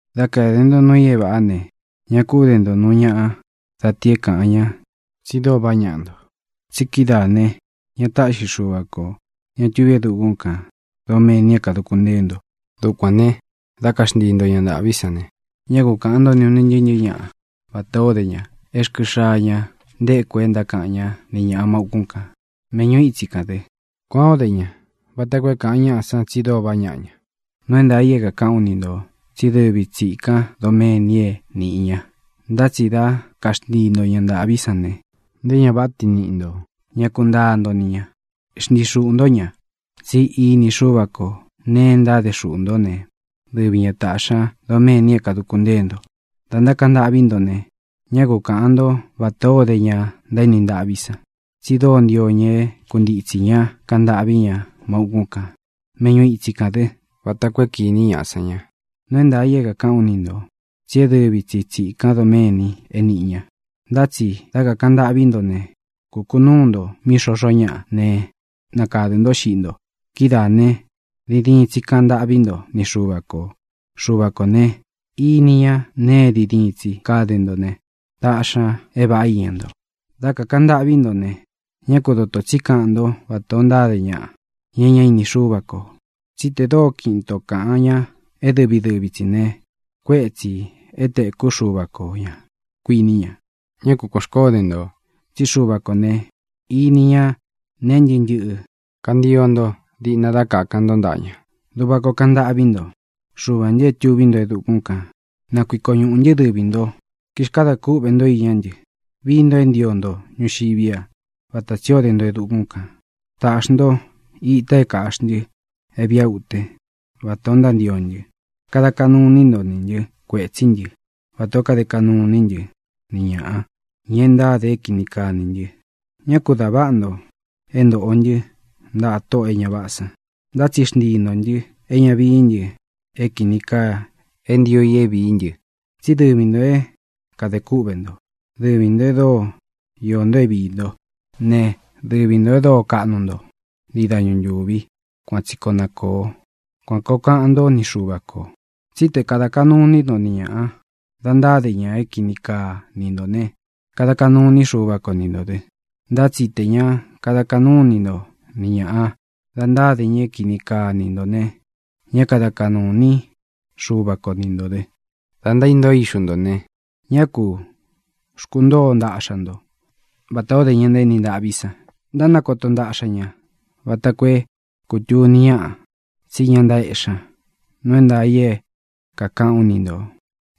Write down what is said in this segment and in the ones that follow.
ʼDá kāde nto nuu i é vāꞌá ne, ña kú de nto nūu ñaꞌa da ti é kāꞌan ñá tsi dóo vaꞌá ñaꞌa nto. Tsi kidáā ne, ña táꞌxi Xuva kō, ña tuví e dukún kān, doméni é kāduku ntée nto. Dukuān ne, dá kaxntii nto ña ntāꞌví san ne, ñá ku kaꞌān ntó ni ūn ntɨɨ́ ntɨ̄ɨ́ ñaꞌa vatā ó de ñaꞌa é rkɨ xaa ña ntéku e ntákaꞌan ñá ni ñāꞌa má ūkún kān, méꞌñu itsi kān dɨ. Kuān ó de ña vata koo é kāꞌan ñáꞌa san tsi dóo vaꞌá ñaꞌa ña. Nuu é ntaā i é kākaꞌán u ni ntō, tsí e dɨ́vi tsi tsīkan doméni é nīꞌi ña. Ntá tsi dá kaxntii nto ña ntāꞌví san ne, nté ña váꞌa tiin niꞌi ntō ña ku ntáa nto ni ñā. Xntii xuꞌū ntó ña. Tsí ini Xúva kō neé ntáde xuꞌū ntó ne, dɨvi ña taꞌxī ña doméni é kāduku ntée nto. ʼDā ntákaꞌan ntâꞌví nto ne, ñá ku kaꞌān ntó vatā ó de ña ntaéni ntaꞌví san. Tsi dóo ntio ña é kuntitsī ña kaꞌan ntâꞌví ña má ūkún kān, méꞌñu itsi kān dɨ́, vata koo é kīní ñaꞌa san ña. Nuu é ntaā i é kākaꞌán u ni ntō tsí e dɨ́vi tsi tsīkan doméni é nīꞌi ña. Ntá tsi dá kakāꞌan ntâꞌví nto ne, kukunūu nto mí xoxó ñaꞌa ne, nakadɨ̄ ntó xiꞌí nto. Kidáā ne, diin diin tsi káꞌan ntâꞌví nto ni Xuva kō. Xuva kō ne, ini ña neé é diin diin tsi kade ntó ne, táꞌxi ñā é vāꞌá iña nto. ʼDá kakāꞌan ntâꞌví nto ne, ñá ku dotō tsí kaꞌan ntó vatā ó ntáde ñaꞌa, ña é ñá ini Xúva kō. Tsí tē dóo kiꞌin ito kāꞌan ña é dɨvi dɨvi tsī ne, kuétsī é tēkú Xuva ko ñā, kuiní ña. Ñá ku kuān xkoó de nto, tsí Xuva kō ne, ini ña nee ntɨ́ꞌɨ ntɨꞌɨ kantio nto diꞌna dá kākan ntó ntaꞌa ña. Duꞌva koo kaꞌan ntâꞌví nto: Xuvā ntɨ é tuví nto e dukún kān, na nakuiko ñuꞌū ntɨ́ dɨvī nto. Kixkada kúꞌvē ntó iñá ntɨ. Vií nto é ntio nto ñuxiví a, vatā tsi ó de nto e dukún kān. Tāꞌxi nto ita é kāꞌxí ntɨ é vīꞌa é uten, vatā ó ntántio ntɨ. Kada kaꞌnu iní nto nī ntɨ kuétsī ntɨ́, vatā ó kade kaꞌnu iní ntɨ ni ñāꞌa, ña e ntáde é kini kaa nī ntɨ. Ñá ku dā váꞌa ntō é ntōꞌo ntɨ́ ntaꞌa tóꞌō e ña váꞌā san, ntá tsi xntii ntō ntɨ é ña vií ntɨ é kīni kaa é ntio i é vīí ntɨ. Tsí dɨvi ntō é kadē kúꞌvē nto; dɨvi ntō e dóo iō nto é viī ntó ne, dɨvi ntō e dóo kaꞌnu nto ntii dañu ntūvi. Kuan tsi koo na kōo. Kuan kōo kaꞌan ntó ni Xuva kō. ʼTsí te kāda kaꞌnu iní nto ni ñāꞌa dá ntáde ña é kini kaa ni ntō né, kada kaꞌnu iní Xuva ko ni ntō dɨ. Ntá tsi tē ña kada kaꞌnú ini nto ni ñāꞌa dá ntáde ña é kini kaa ni ntō ne, ñá kada kaꞌnū iní Xuva ko ni ntō dɨ. ʼDá ntaíntoo ixu ntō ne, ñá kū xkuntóo ntaꞌxa ntó vatā ó de ña ntaéni ntaꞌví san. Ntánakoto ntaꞌxa ña vata koo é kūtuni ñáꞌa tsí ña ntaéꞌxi ña. Nuu é ntaā i é kākaꞌán u ni ntō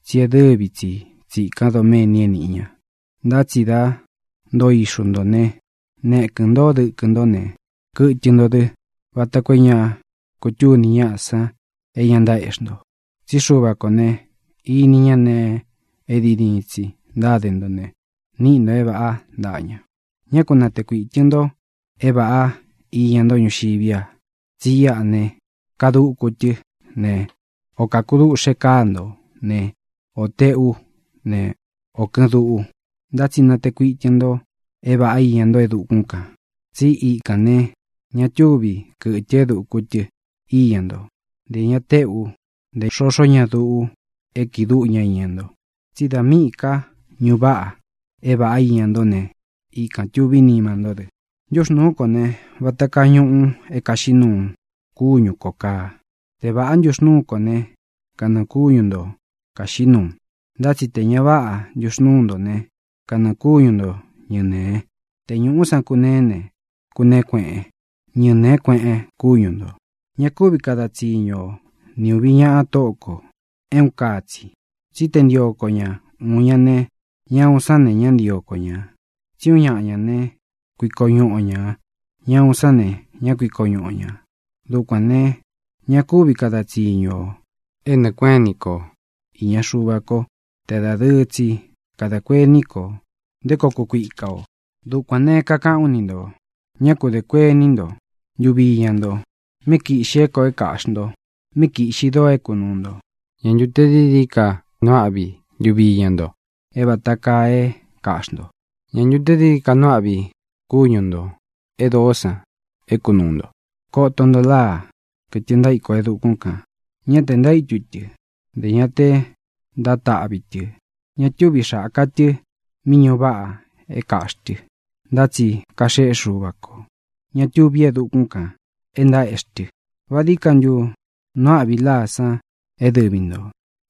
tsí e dɨ́vi tsi tsīkan doméni é nīꞌi ña. Ntá tsi dá ntoo ixu ntō né, nekɨ̄n ntó dɨkɨ ntó ne, kɨtɨ nto dɨ, vata koo é ña kutúni ñáꞌa san é ña ntaéꞌxi nto. Tsí Xuva kō ne, ini ñá nēe é diin diin tsi ntáde ntó ne, niꞌi nto é vāꞌá ntaꞌa ña. ʼÑá ku nātee kuitɨn nto é vāꞌá iña nto ñuxiví a, tsí iꞌa ne, kaduku tɨ ne, ō kakuduꞌxe káa nto ne, ō teꞌú ne, ō kɨꞌɨn duꞌu. Ntá tsi natee kuitɨn nto é vāꞌá iña nto e dukún kān. Tsí ikān ne, ña túvi kɨtɨ é duku tɨ iña nto, ntē ña téꞌu, ntē xoxó ña duꞌu é kiꞌi dúꞌu ña iña nto. Tsí dā míꞌī ká ñuꞌu váꞌa é vāꞌá iña ntó ne, ikān tuví nima ntó dɨ. ʼNtuxnúu kō ne, vata kaa ñuꞌu é kāxiꞌí nuu kúñu ko kāa. Te vāꞌá ntuxnūú nto ne, kanɨɨ̄ kúñu nto kāxiꞌí nuu. Ntá tsi tē ña váꞌa ntuxnūú nto ne, kanɨɨ̄ kúñu nto ñɨnēe. Te ñūꞌú san kuneé ne, kuneé kueꞌen. Ñɨnēé kueꞌen kúñu ntō. ʼÑa kúvi kada tsiñu o ni ūvi ñaꞌa tóꞌo kō é uun kaa tsi. Tsí te ntio ko ñá uun ña ne, ñá uun sán ne, ñá ntīo ko ña. Tsí uun ñaꞌa ña ne, kuiko ñuꞌu o ñā; ñá uun sán ne, ñá kuiko ñuꞌu o ñā. Dukuān ne, ña kúvi kada tsiñu ō é nɨɨ̄ kuéꞌen ini ko īña Xuva kó te dadɨɨ tsi kadā kuení ko nté koo kukuika ō. ʼDukuān ne, kakaꞌán u ni ntō: Ñá ku dē kuení nto ntuvi iña nto, míꞌi kīꞌxi é kōꞌo é kāꞌxi nto, míꞌi kīꞌxi doo é kunūu nto. ¿Ñā ntu te dií dií ka nuu áꞌvi ntuvi iña nto é vata kaa e é kāꞌxi nto? ¿Ñā ntu te dií dií ka nuu áꞌvi kúñu ntō é doo san é kunūu nto? Koto nto láa, kɨtɨ ntaíko e dukún kān. Ñá tē ntaítu tɨ, ntē ña te ntátaꞌvi tɨ. Ña túvi xāka tɨ mí ñuꞌu váꞌa é kāꞌxi tɨ. Ntá tsi kaxéꞌe Xuva kō, ñá tuví e dukún kān, e ntaéꞌxi tɨ. ¿Vá dií ka ntu nuu áꞌvi a láa san é dɨvi ntō?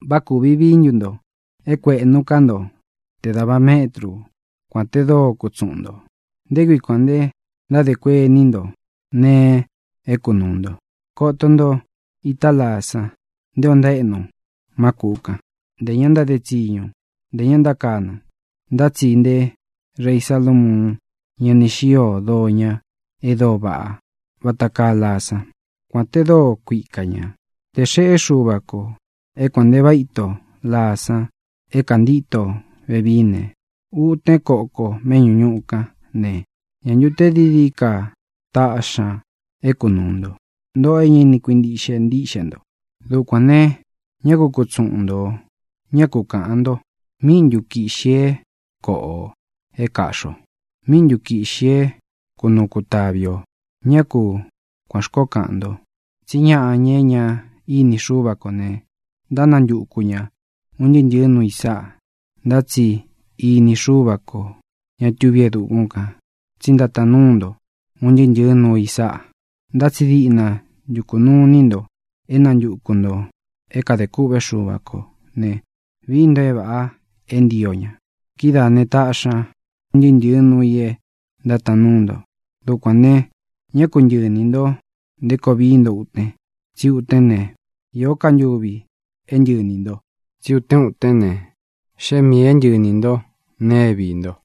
¿Vá kūvi vií ntu nto é kuēꞌnu ká nto te dāva métru, kuān te dóo kutsuꞌun ntō? ʼ¿Nté kui kuān nte ntádē kuení nto nēe é kunūu nto? Koto nto itá laa san nté ō ntaéꞌnu má kūꞌu kan. Ntē ña ntáde tsiñu, ntē ña ntákanɨ. Ntá tsi nté rei Salamuun ña ni xío doo ña e dóo vaꞌá vata kaa laa sán, kuān te dóo kuika ñā. Tē xeꞌé Xuva kō é kuān nte váꞌa ito laa san é kāntíto vevií ne, utén koko meꞌñú ñuꞌu kán ne, ¿ñā ntu te dií dií ka taꞌxi ña é kunūu nto, ntoꞌo é ña ini kuintíꞌxe ntiꞌxe nto? Dukuān ne, ñá ku kutsuꞌun ntō, ñá ku kaꞌān nto: “¿Míꞌi ntu kīꞌxi é koꞌo ō, é kāꞌxi o? ¿Míꞌi ntu kīꞌxi é kunuu kutāvi o?” Ñá ku kuān xkoó kaꞌan nto. Tsí ñaꞌa, ña e ñá ini Xúva kō ne, ntánantuku ña ūn ntɨɨ́ ntɨ̄ɨ́ nuu i sáꞌa. Ntá tsi ini Xúva kō, ña tuví e dukún kān, tsí ntátaan núu nto un ntɨɨ́ ntɨ̄ɨ́ nuu i sáꞌa. Ntá tsi diꞌna ntukū nuu iní nto é nantuku ntō é kadē kûꞌvé Xuva kō ne, vií nto é vāꞌa é ntio ña. Kidáā ne, taꞌxi ña un ntɨɨ́ ntɨ̄ɨ́ nuu i é ntátaan núu nto. Dukuān ne, ñá ku ntɨꞌɨ inī nto nté koo vií nto uten, tsí utén ne, īó ka ntuvi é ntɨꞌɨ iní nto. Tsí utén utén ne, xée miī é ntɨꞌɨ iní nto nēe é viī nto.